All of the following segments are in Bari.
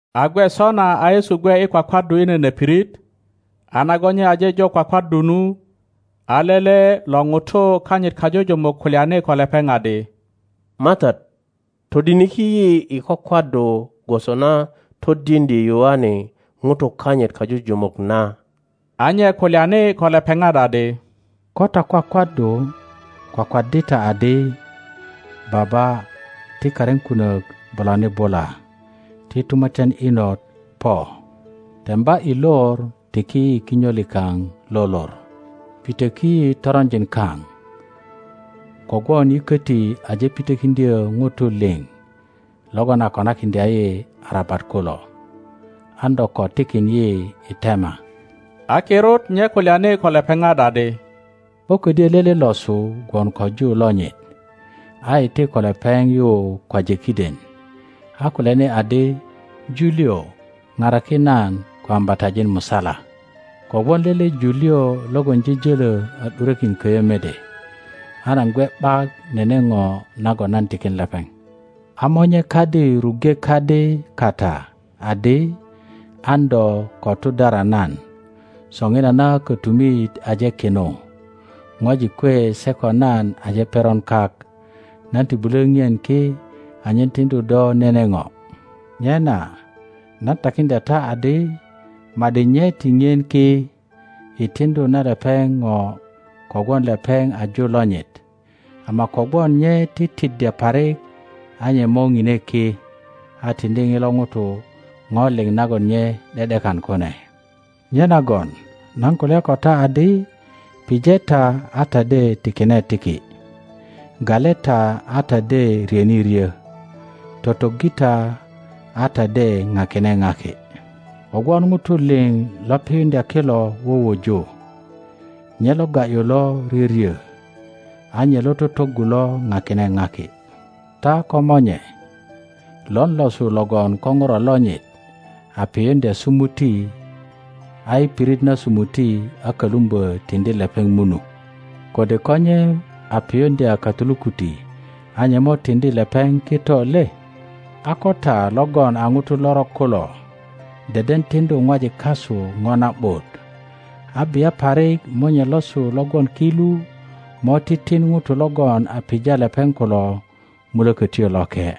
A gwe sona a Yesu gwe i kwakwaddu i nene pirit, a nagon nye aje jo kwakwaddu nu, a lele lo ŋutu kanyit kajujumuk kulyani ko lepeŋ adi, MATAT, todiniki yi i kwakwaddu gwoso na todiŋdye Yoane ŋutu kanyit kajujumuk na. A nye kulyani ko lepeŋat adi, Ko ta kwakwaddu, kwakwaddi ta adi, Baba, ti karin kunök bulani bula;ti tumatyan inot po. Temba i lor tiki yi kinyo likaŋ lo lor. Pitöki yi toronjin kaŋ, kogwon yi köti aje pitokiŋdyö ŋutu liŋ logon a konakiŋdya yi arabat kulo. An do ko tikin yi i tema. A kirut nye kulyani ko lepeŋat adi, Ko kodyö lele losu gwon ko ju lonyit a iti ko lepeŋ yu kwaje kiden, a kulyani adi, Ju liŋ, paraki nan ko ambatajin musala, kogwon lele ju liŋ logon jöjolo a ’durökin köyö mede, a nan gwe ’bak nene ŋo nagon nan tikin lepeŋ. A monye kadi ruŋge kadi kata adi, An do ko tudara nan. Soŋinana kötumit aje kinu, ŋwajik kwe se ko nan aje peron kak; nan ti bulö ŋien ki anyen tiŋdu do nene ŋo. Nyena nan takiŋdya ta adi, ma ’di nye ti ŋien ki i tiŋdu na lepeŋ ŋo kogwon lepeŋ a ju lonyit, ama kogwon nye titiddya parik a nye mo ŋine ki a tiŋdi ŋilo ŋuto ŋo liŋ nagon nye ’de ’dekan kune. Nyenagon nan kulya ko ta adi, Pije ta, a ta de tikine tiki; gale ta, a ta de ryöni ryö; totoggi ta, a ta de ŋakine ŋaki; kogwon ŋutu liŋ lo piyuŋdya kilo wuwuju, nye lo ga ’yu lo ryöryö, a nye lo totoggu lo ŋakine ŋaki. Ta komonye, lon losu logon ko ŋuro lonyit a piyuŋdya sumuti, a i pirit na somuti a kölumbö tiŋdi lepeŋ munu? Kode ko nye a piyuŋdya katulukuti a nye mo tiŋdi lepeŋ kito le? a ko ta logon a ŋutu lorok kulo deden tiŋdu ŋwajik kasu ŋo na ’but, a bia parik Monye losu lo gwon ki lu mo titin ŋutu logon a pija lepeŋ kulo Mulökotyo Loke!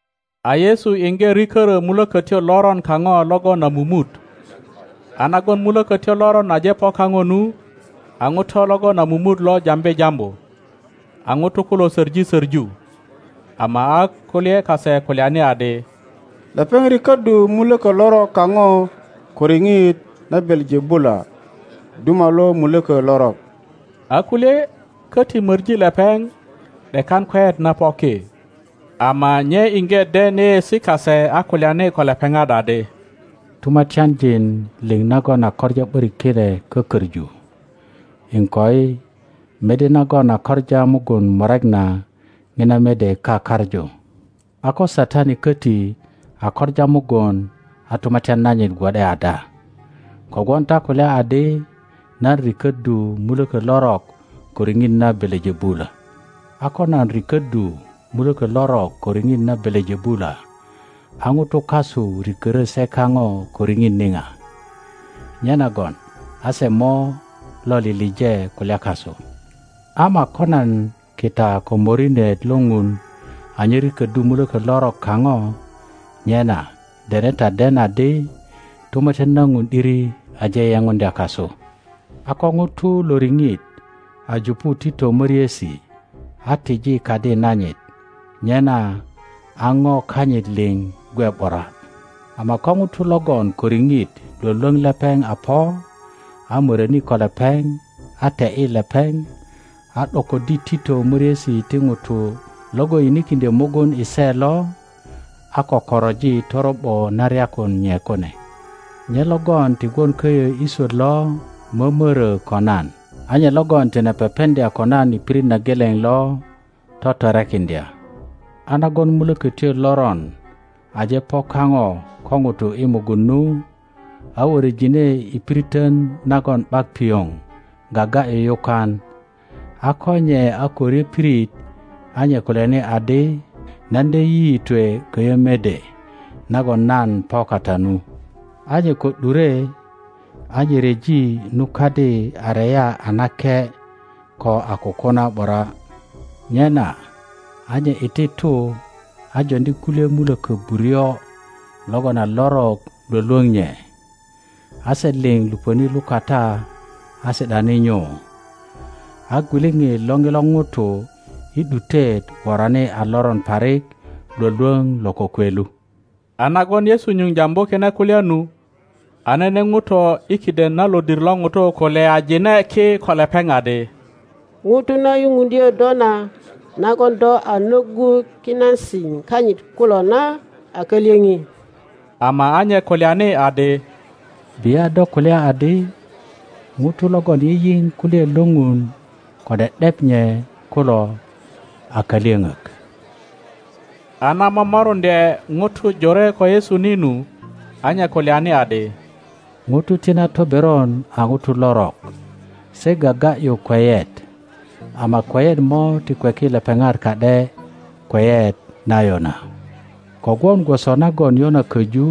A Yesu iŋge rikörö mulökötyo loron kaŋo logon a mumut. A nagon mulökötyo loron aje po kapo nu, a ŋuto logon a mumut lo jambi jambu. A nutu kulo soŋi soŋu. Ama a kulye kase kulyani adi, Lepeŋ rikoddu muloko lorok kaŋo ko riŋit na Belejebula, duma lo mulökö lorok. A kulye koti mori lepeŋ, ’dekan kweyet na po ki. Ama nye iŋge den yeyeesi kase a kulyani ko lepeŋat adi, Tumatyanjin liŋ nagon a koŋa ’borik kine kokoŋu, iŋkoi, mede nagon a koŋa mugun murek na, ŋina mede kakaŋu. a ko Satani koti a koŋa mugun a tumatyan nanyit gwo ’de ada? Kogwon ta kulya adi nan rikoddu muloko lorok ko riŋit na Belejebula. A ko nan rikoddu muloko lorok ko riŋit na Belejebula, a ŋutu kasu rikörö se kaŋo ko riŋit niŋa? Nyenagon a se mo lo lilije kulya kasu. Ama ko nan kita ko morinet lo Ŋun anyen rikoddu muloko lorok kaŋo, nyena dene ta den adi, Tumatyan na Ŋun ’diri aje yeŋundya kasu. A ko ŋuto lo riŋit a jupu tito moriesi a tiji kadi nanyit, nyena aŋo kanyit liŋ gwe ’bura. Ama ko ŋuto logon ko riŋit lwölwöŋ lepeŋ a po, a möroni ko lepeŋ, a te ’yi lepeŋ, a ’dokoddi tito möriesi ti ŋuto logon yinikiŋdyö mugun i se lo, a kökoroji toro ’bo na ryakun nye kune. Nye logon ti gwon köyö i swöt lo mömoro ko nan, a nye logon tine pepeŋdya ko nan i pirit na geleŋ lo totorekiŋdya. A nagon mulökötyo loron aje po kaŋo ko ŋuto i mugun nu, a worojinei piritön nagon ’bak pioŋ gaga ’yu yukan; a ko nye a ko ryö pirit a nye kulyani adi, Nan de yiyitwe köyö mede nagon nan po kata nu. a nye ko ’dure, a nye ryeji nu kadi a reya a nake, ko a kukuna ’bura. Nyena a nye i ti tu a joŋdi kulye mulökö buryo logon a lorok lwölwoŋ nye, a se liŋ lupöni lukata a si ’dani nyu; a gwiliŋit lo ŋilo Ŋuto i ’dutet worani a loron parik lwölwöŋ lo kokwe lu. A nagon Yesu nyuŋ jambu kine kulya nu, a nene ŋuto i kiden na lodir lo ŋutu kulyajine ki ko lepeŋ adi, Ŋuto na yupuŋdyö do na nagon do a nöggu kinasi kanyit kulo na a kalyoŋi. Ama a nye kulyani adi, Bia do kulya adi, Ŋutu logon yiyiŋ kulyaet lo Ŋun ko ’de ’dep nye kulo a kalyöŋök. A na momoruŋdye ŋutu jore ko Yesu ni nu, a nye kulyani adi, Ŋutu ti na toberon a ŋutu lorok; se gaga ’yu kweyet, ama kweyet mo ti kweki lepeŋat ka ’de kweyet na Yona. Kogwon gwoso nagon Yona köju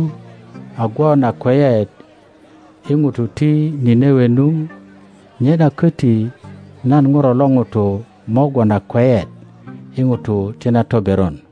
a gwon a kweyet i ŋutu ti Ninewe nu, nyena köti nan Ŋuro lo ŋuto mo gwon a kweyet i ŋutu ti na toberon.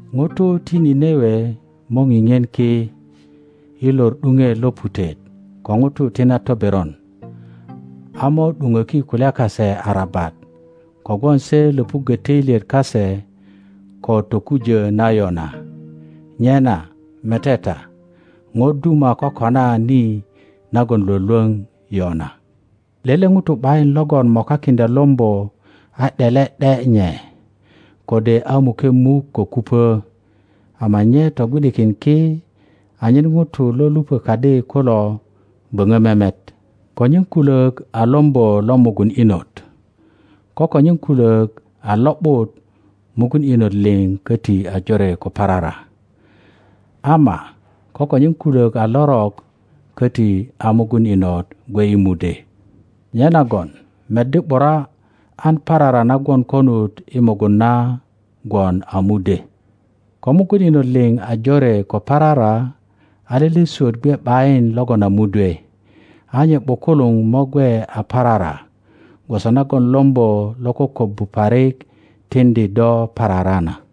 ŋutu ti Ninewe mo ŋiŋien ki i lor ’duŋet lo putet ko ŋutu ti na toberon, a mo ’duŋöki kulya kase arabat, kogwon se löpuggö töilyet kase ko tokujö na Yona; nyena mete ta, ŋo duma kokona ni nagon Iwolwöŋ Yona. Lele ŋuto ’bayin logon mokakiŋdya lombo a ’dele ’de nye, kode a muke muk ko kupö, ama nye togwi ’dikin ki anyen ŋutu lo lupö kadi kulo boŋo memet. Konyen kulök a lombo lo mugun inot; ko konyen kulok a lo ’but mugun inot liŋ koti a jore ko parara; ama ko konyen kulök a lorok. köti a mugun inot gwe i mudwe. Nyenagon meddi ’bura an parara na gwon konut i mugun na gwon a mudwe. Ko mugun inot liŋ a jore ko parara, a lele swöt gwe ’bayin logon a mudwe, a nye ’bukuluŋ mo gwe a parara gwoso nagon lombo lo kokobbu parik tiŋdi do parara na.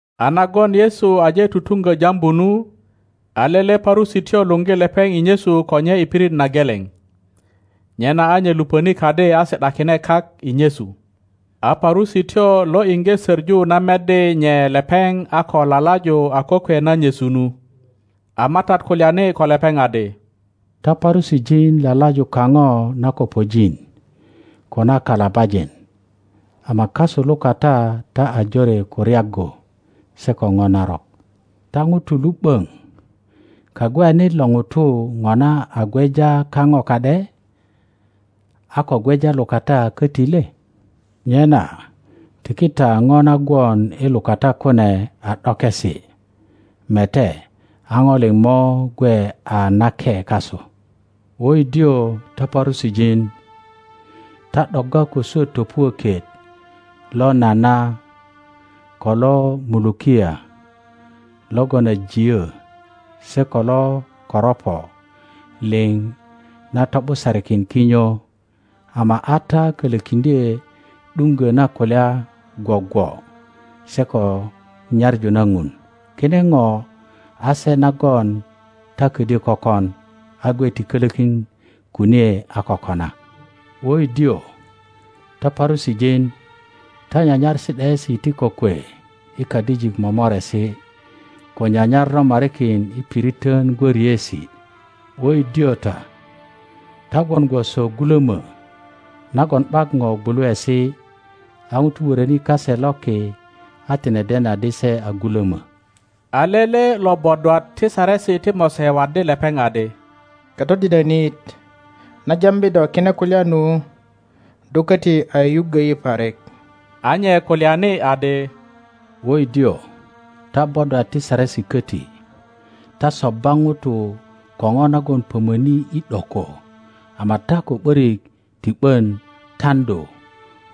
A nagon Yesu aje tutuŋgö jambu nu, a lele Parusityo luŋgi lepeŋ i nyesu ko nye i pirit na geleŋ. Nyena a nye luponi kadi a si ’dakine kak i nyesu. A Parusityo lo iŋge söŋu na meddi nye lepeŋ a ko lalaju a kokwe na nyesu nu. A MATAT kulyani ko lepeŋ adi, Ta Parusijin lalaju kaŋo na kopojin ko na kalabajin; ama kasu lukata ta a jore ko ryaggu se ko ŋo narok. Ta ŋutu lu ’böŋ, Kagweyanit lo ŋutu ŋona a gweja kaŋo ka ’de, a ko gweja lukata köti le? Nyena tiki ta ŋo na gwon i lukata kune a ’dokesi; mete, a ŋo liŋ mo gwe a nake kasu. Woidio ta Parusijin! Ta ’dogga ko swöt topuökit lo nana ko lo mulukia logon a jiyo, se ko lo koropo liŋ na to ’busarikin kinyo, ama a ta kölökiŋdye ’duŋgo na kulya gwogwo se ko nyaŋu na ŋun. Kine ŋo a se nagon ta kodyö kökon, a gwe ti kölokin kunie a ko kona. Woidio ta Parusijin! Ta nyanyar si ’daesi ti kokwe i kadijik momoresi, ko nyanyar romarikin i piritön gwöriesi. Woidio ta! Ta gwon gwoso gulomö nagon ’bak ŋo gwuluesi, a ŋutu wöröni kase loki a tine den adi se a gulömo. A lele lo bodwat ti Saresi ti Mose waddi lepeŋ adi, Katodinönit, na jambi do kine kulya nu, do koti a yuyuggö yi parik. a nye kulyani adi, Woidio ta bodwat ti Saresi köti! Ta sobba ŋutu ko ŋo nagon pömöni i ’doko ama ta ko ’börik ti ’bön taŋdu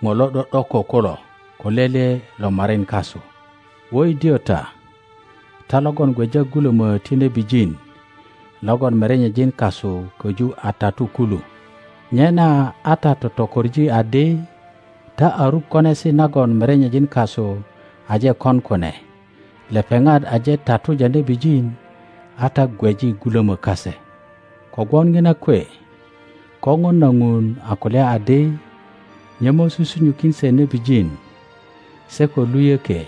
ŋo lo ’do ’doko kulo ko lele lo morin kasu. Woidio ta! Ta logon gweja gulomö ti nebijin logon merenyejin kasu köju a tatu kulu. Nyena a ta totokoŋi adi ta a ruk konesi nagon merenyejin kasu aje kon kune; lepeŋat aje tatuja nebijin, a ta gweji gulomö kase. Kogwon ŋina kwe Koŋon na Ŋun a kulya adi, Nye mo susunyukin se nebijin se ko luyökie,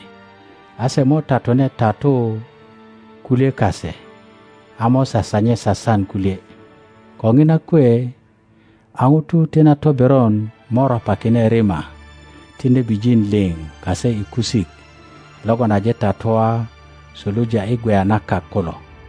a se mo tatune tatu kulye kase, a mo sasanye sasan kulye. Ko ŋina kwe a ŋutu ti na toberon mo ropakine rima ti nebijin liŋ kase i kusik logon aje tatua suluja i gweya na kak kulo,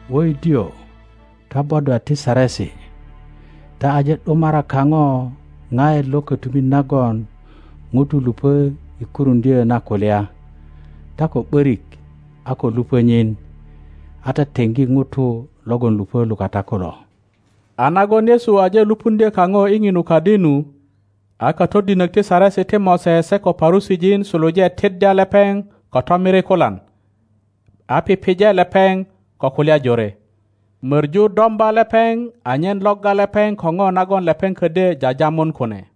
Wöidiö ta bodwat ti Saresi! Ta aje ’dumara kaŋo ŋaet lo kotumit nagon ŋutu lupö i kuruŋdyö na kulya; ta ko ’börik a ko lupö nyin, a ta teŋgi ŋutu logon lupö lukata kulo. A nagon Yesu aje lupuŋdyo kaŋo i ŋinu kadi nu, a katodinök ti Saresi ti Mose se ko Parusijin suluje tiddya lepeŋ ko tomirikulan, a pije lepeŋ ko kulya jore, möŋu domba lepeŋ anyen logga lepeŋ ko ŋo nagon lepeŋ kodyo jajamun kune.